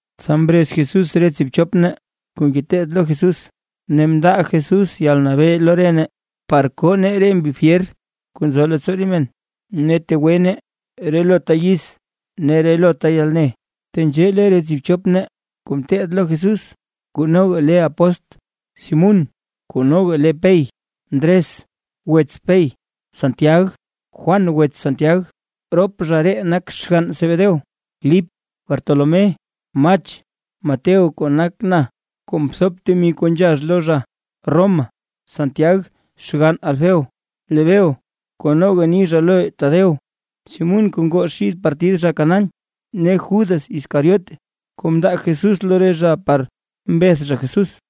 Tsa mrez Jesús re tsiibchop nee kuu ngeteed lo Jesús ne mndaa Jesús yalnabee lo nee, par koo nee re mbi fyer kuu nzo leettsoo re men, ne tegwe nee relota yiz ne relota yalne. Tenzhee le re tsiibchop nee kuu mteed lo Jesús kuu noga le apóstl: Simún (kuu noga le Pey), Ndres (wets Pey), Santiag, Juan (wets Santiag, rop zha ree nak xgann Zebedeo), Lip, Bartolomé, Mach, Mateo (kuu nak na, kuu mthop temi kuu nzhax lo zha Roma), Santiag (xgann Alfeo), Lebeo (kuu noga ni zha lo Tadeo), Simún (kuu ngoo xid partid zha Canaán) ne Judas Iscariote (kuu mndaa Jesús lo re zha par mbeth zha Jesús).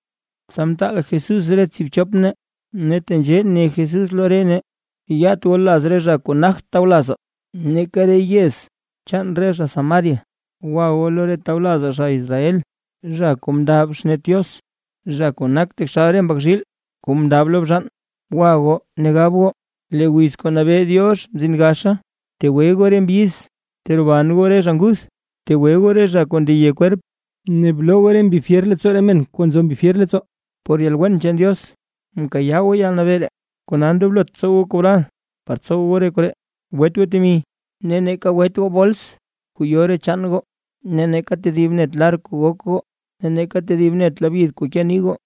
Tsa mtaal Jesús re tsiibchop nee ne tenzhee ne Jesús lo re nee: ―Yat goo laz re zha kuu nagt tawlazaa, neeka re yez chaan re zha Samaria. Gwa goo lo re tawlazaa zha Israel, zha kuu mndab xnet Diox, zha kuu nak taxal re mbak zhiil kuu mndab lo bzhaan. Gwa goo ne gab goo, lee wiz kuu nabee Diox mzin gaxa. Btegwe goo re mbyiz, teroban goo re zha nguth, btegwe goo re zha kuu ndeye kwerp, ne bloo goo mbi fyer leettsoo re men kuu nzo mbi fyer leettsoo. Por yalwen chaan Diox mkayaa goo yalnabee ree; kona ndoblot tsow goo kobral por tsow goo re koree. ’Gwet goo temi. Neeka gwet goo bols kuu yo re chaan goo, neeka tedib net lar kuu gok goo, neeka tedib net labyid kuu ke nii goo,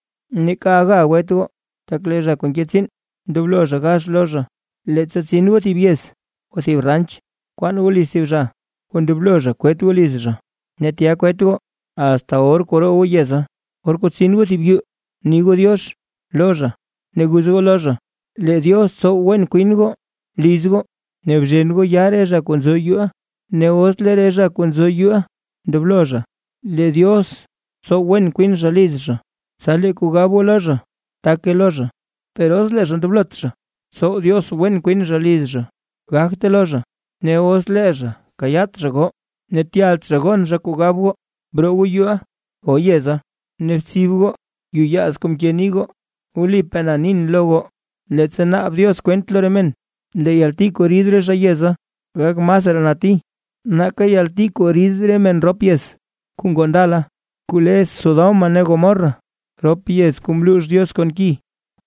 neeka aga gwet goo, tak lee zha kuu nke tsiin ndoblo zha gax lo zha. ’Leettsa tsin goo thib yez o thib ranch, kwaan goo liz thib zha kuu ndoblo zha kwet goo liz zha, ne tya kwet goo asta or kuu roo goo yeza. Or kuu tsin goo thib yuu bni goo “diox” lo zha ne guz goo lo zha, lee Diox tsow wen kwin goo liz goo ne bzhen goo yaa re zha kuu nzo yuuʼa. Ne os lee re zha kuu nzo yuuʼa, ndoblo zha lee Diox tsow wen kwin zha liz zha, tsa lee kuu gab goo lo zha, take lo zha; per os lee zha ndoblot zha tsow Diox wen kwin zha liz zha, gagte lo zha. Ne os lee zha kayaat zha goo ne tyalt zha gon zha kuu gab goo, broo goo yuuʼa o yeza ne btsib goo yuyaaz kuu mke nii goo. Wlipaa na nin lo goo, leettsa naab Diox kwent lo re men, lee yalti kuu rid re zha yeza, gak masraa nati nake yalti kuu rid re men rop yez kuu ngoo ndala kuu le Sodoma ne Gomorra, rop yez kuu mluux Diox kon ki.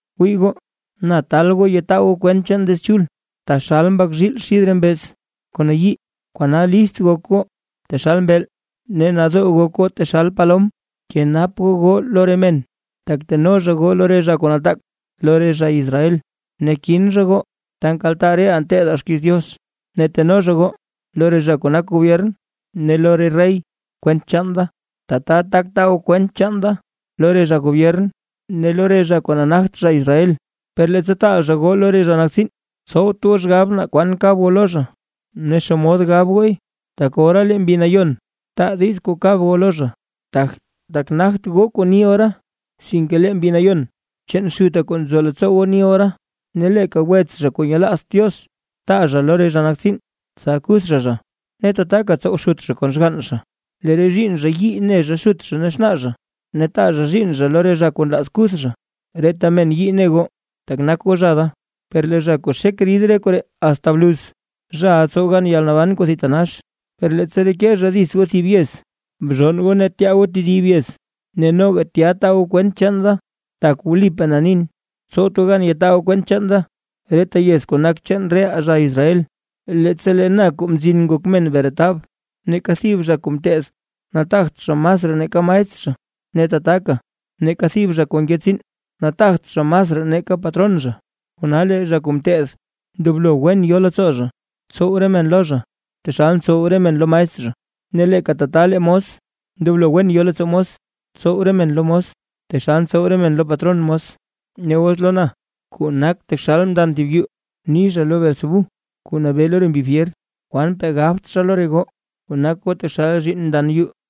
’¡Wii goo! Na taal goo yataa goo kwent chaan Diiz Chul, taxal mbak zhiil xid re mbeez kuu nayii, kona list gok goo taxal mbeel ne nadoo gok goo taxal palom. Bkenap goo goo lo re men, tak teno zha goo lo re zha kuu nataak lo re Israel, ne kin zha goo ta nkaltaa reʼaa nteedaa xkiiz Diox. Ne teno zha goo lo re zha kuu nak gobyern ne lo re rey kwent chaan da, tata tak taa goo kwent chaan da lo re zha gobyern ne lo re zha kuu nagt zha Israel. Per leettsa taa zha goo lo re zha nak tsiin, tsowt goo xgab naa kwan kab goo lo zha ne xomod gab gooy, tak ora lee Mbi Nayon taa diiz kuu kab goo lo zha, tak nagt goo kuu ni ora, sinke lee Mbi Nayon chaan Xutaa kuu nzo leettsoo goo ni ora. ’Ne leeka wets zha kuu nyelaazt Diox, taa zha lo re zha nak tsiin tsa kuth zha zha, ne tataka tsow xut zha kon xgann zha. Lee re zhiinn zha yii ne xut ne xnaa, ne taa zhiinn zha zha lo re zha kuu nlaaz kuth zha. Reta men yii ne goo tak nak goo zha da. Per lee zha kuu xek rid re koree asta bluz, zhaʼa tsow gan yalnaban kuu thitanax. Per leettsa reke zha dits goo thib yez, bzhonn goo ne tyaa goo tedib yez ne noga tya taa goo kwent chaan da. Tak wlipaa na nin, tsowt goo gan yataa goo kwent chaan da, reta yez kuu nak chaan reʼaa zha Israel, leettsa lee na Kuu Mzin Ngok Men bretab. ’Neeka thib zha kuu ngeteed nataagt zha masraa nake maestr zha, ne tataka neeka thib zha kuu nke tsiin, nataagt zha masraa nake patron zha. Kona lee zha kuu ngeteed, ndoblo wen yo leettsoo zha, tsow re men lo zha taxal ntsow re men lo maestr zha, ne leeka tata lee mos, ndoblo wen yo leettsoo mos, tsow re men lo mos taxal ntsow re men lo patron mos. Ne os lo na kuu nak taxal mndan thib yuu ni zha lo Beelzebú kuu nabee lo re mbi fyer. ¡Kwanpaa gabt zha lo re goo kuu nak goo taxal zhiinn mndan yuu!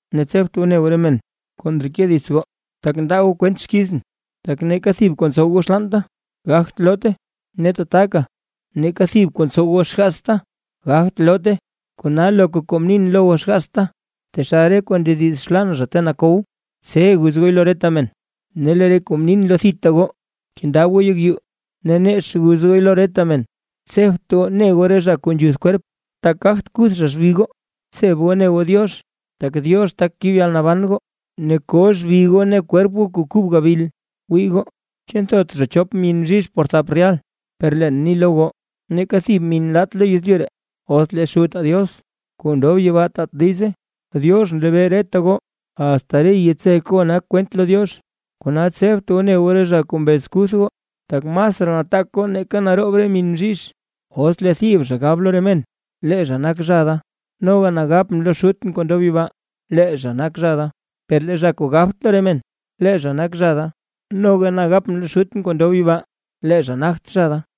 ’Ne tsebt goo ne goo re men kuu ndreke dits goo, tak ndaa goo kwent xkizʼn. “Tak neeka thib kuu ntsow zha xlaanta gagt loote, ne tataka neeka thib kuu ntsow zha xgaatsta gagt loote”. Kona loka kuu mnin lo goo xgaatsta, taxal re kuu ndediz xlaan zha ta nakow, tse guz gooy lo reta men; ne lee re kuu mnin lo thita goo, kendab goo yek yuu ne nex guz gooy lo reta men. Tsebt goo ne goo re zha kuu nzhuth kwerp, tak gagt kuth zha xbi goo. Btseb goo ne goo Diox, tak Diox tak kib yalnaban goo ne ko xbi goo ne kwerp goo kuu kub gabil. ’Wii goo, ¿chu nthot zha chop min bzhizh por thap rehal? Per leen ni lo goo, neeka thib min lat lo yezlyu ree os lee Xutaa Diox kuu ndob yibaa taat diize. Diox nlebee reta goo, asta re yitsek goo nak kwent lo Diox. Kona tsebt goo ne goo re zha kuu mbez kuth goo, tak masraa nataak goo nake naroob min bzhizh. ’Os lee thib zha gab zha lo re men lee zha nak zha da, noga na gapʼn lo Xutʼn kuu ndob yibaa lee zha nak zha da. Per lee zha kuu gabt lo re men lee zha nak zha da, noga na gapʼn lo Xutʼn kuu ndob yibaa lee zha nagt zha zha da.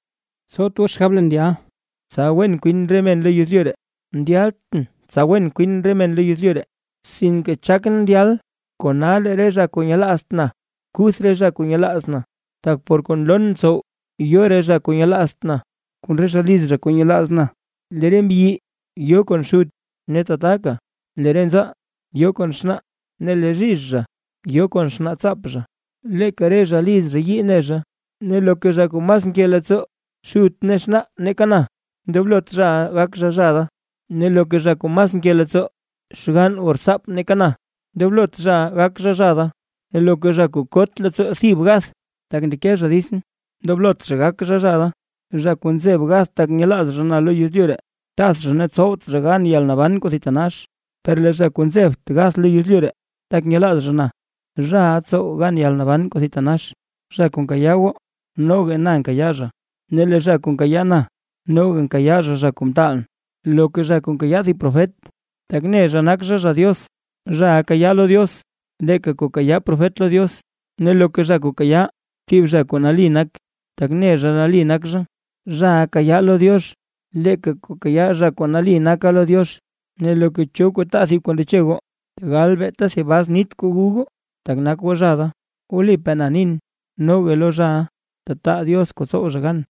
’Tsowt goo xgab leen ndyal, tsa wen kwin re men lo yezlyu ree. Ndyaltʼn tsa wen kwin re men lo yezlyu ree; sinke chakʼn ndyal kona lee re zha kuu nyelaazt na kuth re zha kuu nyelaaz na. Tak por kuu nloon tsow yo re zha kuu nyelaazt na, kon re zha liz zha kuu nyelaaz na, lee re mbyi yo kon xut, ne tataka lee re nzaa yo kon xnaa, ne lee zhizh zha yo kon xnaatsaap zha. Leeka re zha liz zha yii ne zha. ’Ne loka zha kuu mas nke leettsoo xut ne xnaa nake na, ndoblot zhaʼa gak zha zha da, ne loka zha kuu mas nke leettsoo xgann o rtsaap nake na, ndoblot zhaʼa gak zha zha da, ne loka zha kuu kot leettsoo thib gath, tak ndeke zha ditsʼn, ndoblot zha gak zha zha da. Zha kuu nzeb gath tak nyelaaz zha na lo yezlyu ree, tath zha ne tsowt zha gan yalnaban kuu thitanax, per lee zha kuu nzebt gath lo yezlyu ree, tak nyelaaz zha na, zhaʼa tsow gan yalnaban kuu thitanax. ’Zha kuu nkayaa goo noga na nkayaa zha. Ne lee zha kuu nkayaa na, noga nkayaa zha, zha kuu mtaalʼn. Loka zha kuu nkayaa thib profet, tak ne zha nak zha zha Diox, zhaʼa kayaa lo Diox leeka kuu kayaa profet lo Diox; ne loka zha kuu kayaa thib zha kuu nali nak, tak ne zha nali nak zha, zhaʼa kayaa lo Diox leeka kuu kayaa zha kuu nali naka lo Diox. Ne loka cho zha kuu taa thib kuu ndeche goo, tegal beeta thib bas nit kuu gu goo, tak nak goo zha da, wlipaa na nin, noga lo zhaʼa tataa Diox kuu tsow zha gan.